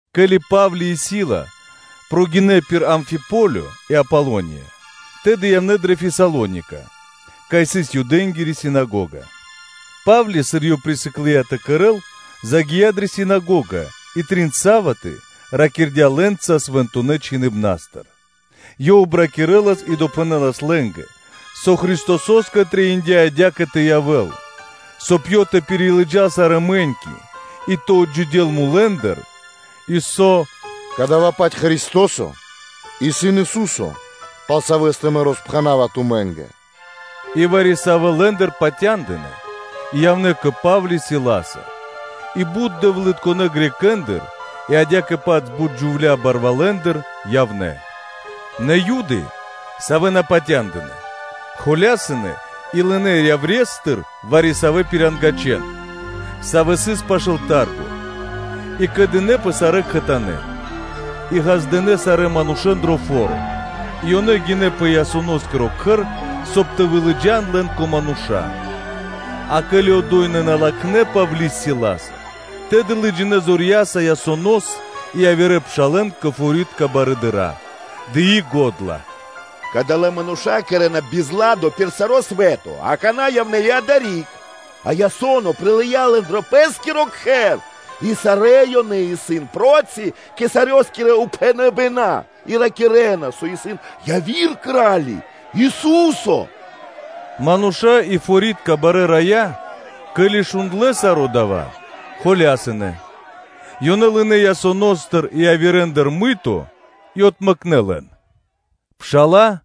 Ке́ли Па́вли и Сила прогинэ́ пир Амфиполё и Аполония, тэды явнэ́ ёнэ дрэ Фесалоника, кай сыс Юдэнгири синагога. Па́вли, сыр ёв присыклыя тэ кэрэ́л, загия́ дрэ синагога и трин са́ваты (суботы) ракирдя́ лэ́нца Свэнтонэ́ Чхиныбна́стыр, ёв обракирэлас и допхэнэлас лэ́нгэ, со Христосо́скэ трэиндя́ адя́кэ тэ явэ́л, соб (кай) Ёв тэ пирилыджал сарэ́ мэ́ньки и тэ отджидёл мулэ́ндыр, и со: “Кадава́-паць Христо́со исын Ису́со, пал Савэ́стэ мэ роспхэнава тумэ́нгэ.” И вари-савэ́ лэ́ндыр патяндынэ́ и явнэ́ кэ Па́вли Силаса, и бут дэвлытконэ́ Грекэ́ндыр (Баламэ́ндыр) и адя́кэ-паць бут джувля́ барвалэндыр явнэ́. Нэ Юды, савэ́ на патяндынэ́, холясынэ и лынэ́ яврестыр вари-савэ́ пирангачэн форуня́тыр (плошча́тыр) и кэдынэпэ сарэ́ кхэтанэ́ и ґаздынэ́ сарэ́ манушэ́н дро фо́ро: и ёнэ гинэ́ пэ Ясоноскиро кхэр, соб (кай) тэ вылыджан лэн кэ мануша́; а ке́ли одо́й ёнэ на латхнэ́ Павли́с Силаса, тэды лыджинэ́ зорья́са Ясонос и явирэ пшалэ́н кэ форитка барыдыра́, дыи го́дла: “Кадалэ́ мануша́ кэрэ́на бизладо пир саро́ свэ́то, а какана́ явнэ́ и адари́к; а Ясоно прилыя́ лэн дро пэ́скиро кхэр; и сарэ́ ёнэ исын проти кхенингоскирэ упхэныбэна́ и ракирэ́на, со исын яви́р кра́ли, Ису́со.” Мануша́ и форитка барэ́ рая́, ке́ли шундлэ́ саро́ дава́, холясынэ. Ёнэ лынэ́ Ясоностыр и явирэндыр сымады́ (залого) и отмэкнэ лэн. Пша́ла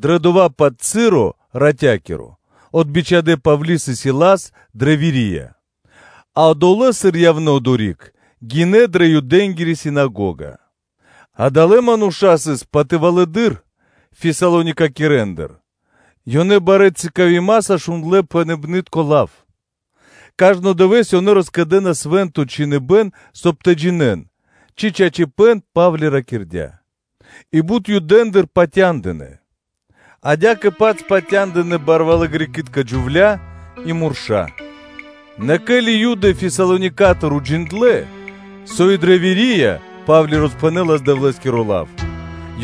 дрэ дова́-паць часо (моменто) ратя́киро отбичхадэ Павли́с и Силас дрэ Верия, а одолэ́, сыр явнэ́ одори́к, гинэ́ дрэ Юдэнгири синагога. Адалэ́ мануша́ сыс патывалэдыр Фесалоникийцэндыр, ёнэ барэ́ якхэ́нца шундлэ́ пхэныбнытко лав, кажно дывэ́с ёнэ роскэдэнас Свэ́нто Чхиныбэ́н, соб (кай) тэ джинэ́н, ци чачипэ́н Па́вли ракирдя́. И бут Юдэндыр патяндынэ́; адя́кэ-паць патяндынэ́ барвалэ́ Греки́тка (Балами́тка) джувля́ и мурша́. Нэ ке́ли Юды Фесалоникатыр уджиндлэ́, со и дрэ Верия Па́вли роспхэнэлас Дэвлэ́скиро лав,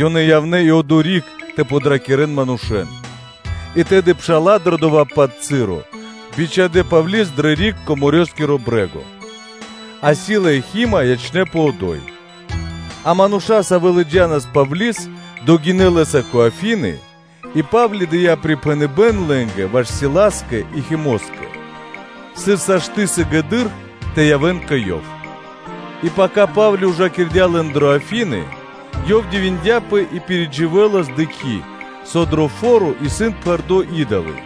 ёнэ явнэ́ и одори́к тэ подракирэн манушэ́н. И тэды пша́ла дрэ дова́-паць часо (моменто) бичхадэ́ Павли́с дрэ риг кэ морёскиро (дэрьявэ́скиро) брэ́го; а Сила и Хима ячнэ́пэ одо́й. А мануша́, савэ́ лыджа́нас Павли́с, догинэ́ лэ́са кэ Афины, и Па́вли дыя́ припхэныбэ́н лэ́нгэ ваш Силаскэ и Химоскэ, сыр сашты́ (можна) сыгэды́р тэ явэ́н кэ ёв. И пака Па́вли ужакирдя лэн дрэ Афины, ёв дивиндяпэ и пиридживэлас, дыкхи́, со дро фо́ро сыс пхэрдо́ и́долы.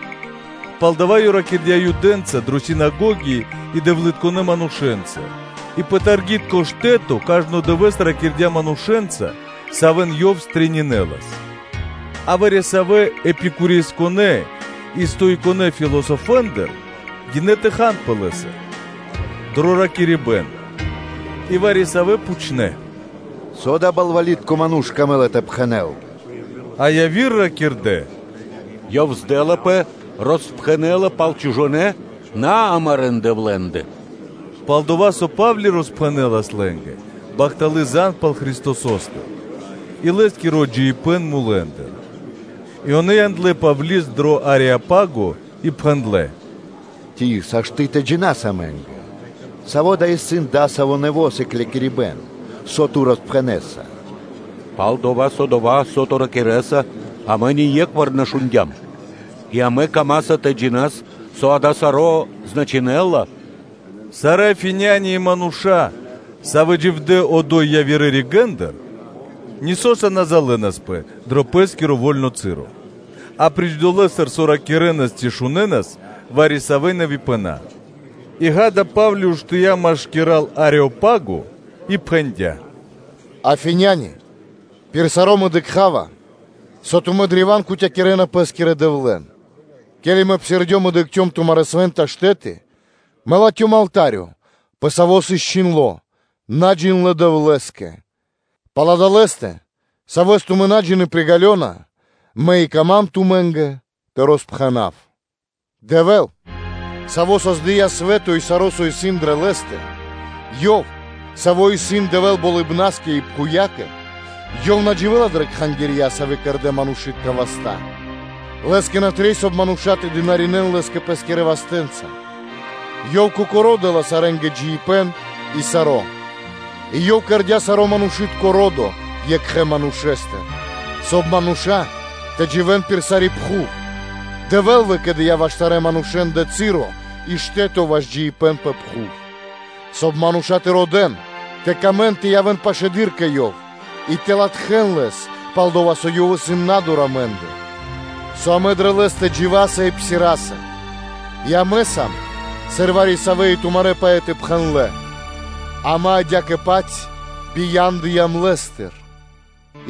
Палдава́ ёв ракирдя́ Юдэнца дрэ синагоги и Наюдэнца (дэвлытконэ́ манушэ́нца), и пэ форуны́ (пло́шча), кажно дывэ́с ракирдя́ манушэ́нца, савэ́н ёв стрэнинэлас (пирилэлас). А вари-савэ́ Эпикуреинэ и Стоиконэ философэндыр гинэ́ тэ ханпэ лэ́са дро ракирибэ́н. И вари-савэ́ пхучнэ́: “Со дава́ балвалитко ману́ш камэ́ла тэ пхэнэ́л?” А яви́р ракирдэ́: “Ёв, здэлапэ, роспхэнэ́ла пал чужонэ́ наамарэ дэвлэндэ?” – пал-дова́ со Па́вли роспхэнэлас лэ́нгэ бахталы́ зан (звесь) пал Христосо́стэ и Лэ́скиро отджидыибэн мулэ́ндыр И ёнэ яндлэ́ Павли́с дро Ареопаго и пхэндлэ́: “Ци сашты́ (можна) тэ джинас амэ́нгэ, саво́ дава́ исын дасаво нэво́ сыклякирибэ́н, со ту роспхэнэса? Пал-дова́ со дова́, со ту ракирэ́са, амэ ние́кхвар на шундя́м; и амэ камаса тэ джинас, со дава́ саро́ значынэ́ла?” Сарэ́ Афиняни и мануша́, савэ́ дживдэ́ одо́й явирэ ригэ́ндыр, нисоса на залэнаспэ дрэ пэ́скиро во́льно часо, апри́ч дова́, со ракирэ́нас, ци шунэнас вари-савэ́ нэвипэна́. И, ґа́да, Па́вли уштыя́ машкира́л Ареопаго и пхэндя́: “Афиняня́лэ! Пир саро́ мэ дыкха́ва, со тумэ́ древа́н кутякирэна пэ́скирэ дэвлэн: ке́ли мэ псирдём и дыкхцём тумарэ́ свэ́нта штэ́ты, мэ латхём алта́рё, пэ саво́ сыс чхиндло́: “Наджиндлэ Дэвлэ́скэ.” Пал Адалэстэ, Савэс тумэ́ на джины́, приґалёна, мэ и кама́м тумэ́нгэ тэ роспхэнав. Дэвэ́л, Саво́ создыя́ свэ́то и саро́, со исын дрэ лэ́стэ, Ёв, Саво́ исын Дэвэ́л болыбнаскэ и пхувьякэ; Ёв на дживэ́ла дрэ кхангирья, савэ́ кэрдэ́ манушы́тка васта́. Лэ́скэ на трэй, соб (кай) мануша́ тэ дынаринэ́н (тэ служынэн) Лэ́скэ пэ́скирэ вастэ́нца; Ёв Кокоро́ дэ́ла сарэ́нгэ джиибэ́н и саро́; и Ёв кэрдя́ саро́ манушы́тко ро́до екхэ манушэ́стыр, соб (кай) мануша́ тэ дживэ́н пир сари́ пхув; Дэвэ́л выкэдыя́ ваш сарэ́ манушэ́нгэ часо и штэ́то ваш джиибэ́н пэ пхув, соб (кай) мануша́ тэ родэ́н, тэ камэн тэ явэ́н пашылэды́р кэ Ёв и тэ латхэ́н Лэс, пал-дова́ со Ёв исын на́дур амэ́ндыр: со амэ дрэ Лэ́стэ дживаса и псираса и амэ сам, сыр вари-савэ́ и тумарэ́ поэты пхэндлэ́: ‘Амэ адя́кэ-паць бияндыям Лэ́стыр’.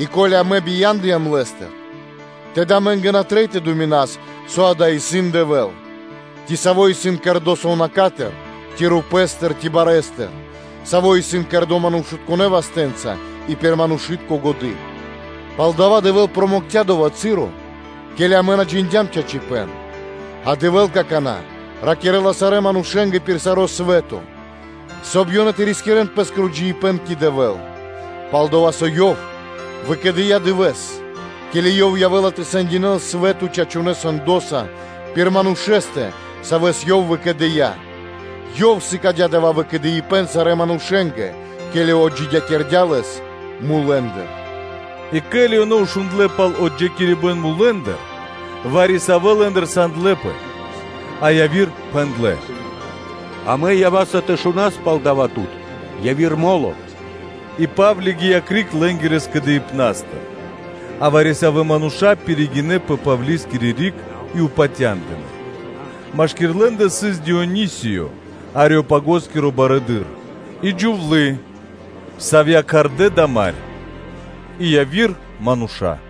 И ко́ли амэ бияндыям Лэ́стыр, тэды амэ́нгэ на трэй тэ думинас, со дава́ исын Дэвэ́л, ци саво́ исын кэрдо́ сувнака́стыр ци рупэ́стыр, ци барэстыр, саво́ исын кэрдо́ манушытконэ́ вастэ́нца и пир манушы́тко годы́. Палдава́ Дэвэ́л промэкця дова́ часо, ке́ли амэ на джиндям чачипэ́н, а Дэвэ́л какана́ ракирэ́ла сарэ́ манушэ́нгэ пир саро́ свэ́то, соб (кай) ёнэ тэ рискирэ́н пэ́скиро джиибэ́н кэ Дэвэ́л, пал-дова́ со Ёв выкэдыя́ дывэ́с, ке́ли Ёв явэ́ла тэ сэндякирэ́л свэ́то чачунэ́ сэндоса пир Манушэ́стэ, Савэс Ёв выкэдыя́, Ёв сыкадя́ дава́ выкэдыибэн сарэ́ манушэ́нгэ, ке́ли отджидякирдя́ Лэс мулэ́ндыр.” И ке́ли ёнэ шундлэ́ пал отджидякирибэн мулэ́ндыр, вари-савэ́ лэ́ндыр сандлэпэ, а яви́р пхэндлэ́: “Амэ ява́са тэ шунас пал дава́ тут яви́р мо́ло.” И Па́вли гия́ криг лэ́нгирэ скэдыибна́стыр. А вари-савэ́ мануша́ пиригинэ́ пэ Павлискири риг и патяндынэ́; машки́р лэ́ндэ сыс Дионисиё, Ареопагоскиро барыдыро́, и джувлы́, савья́ кхардэ́ Дамарь, и яви́р мануша́.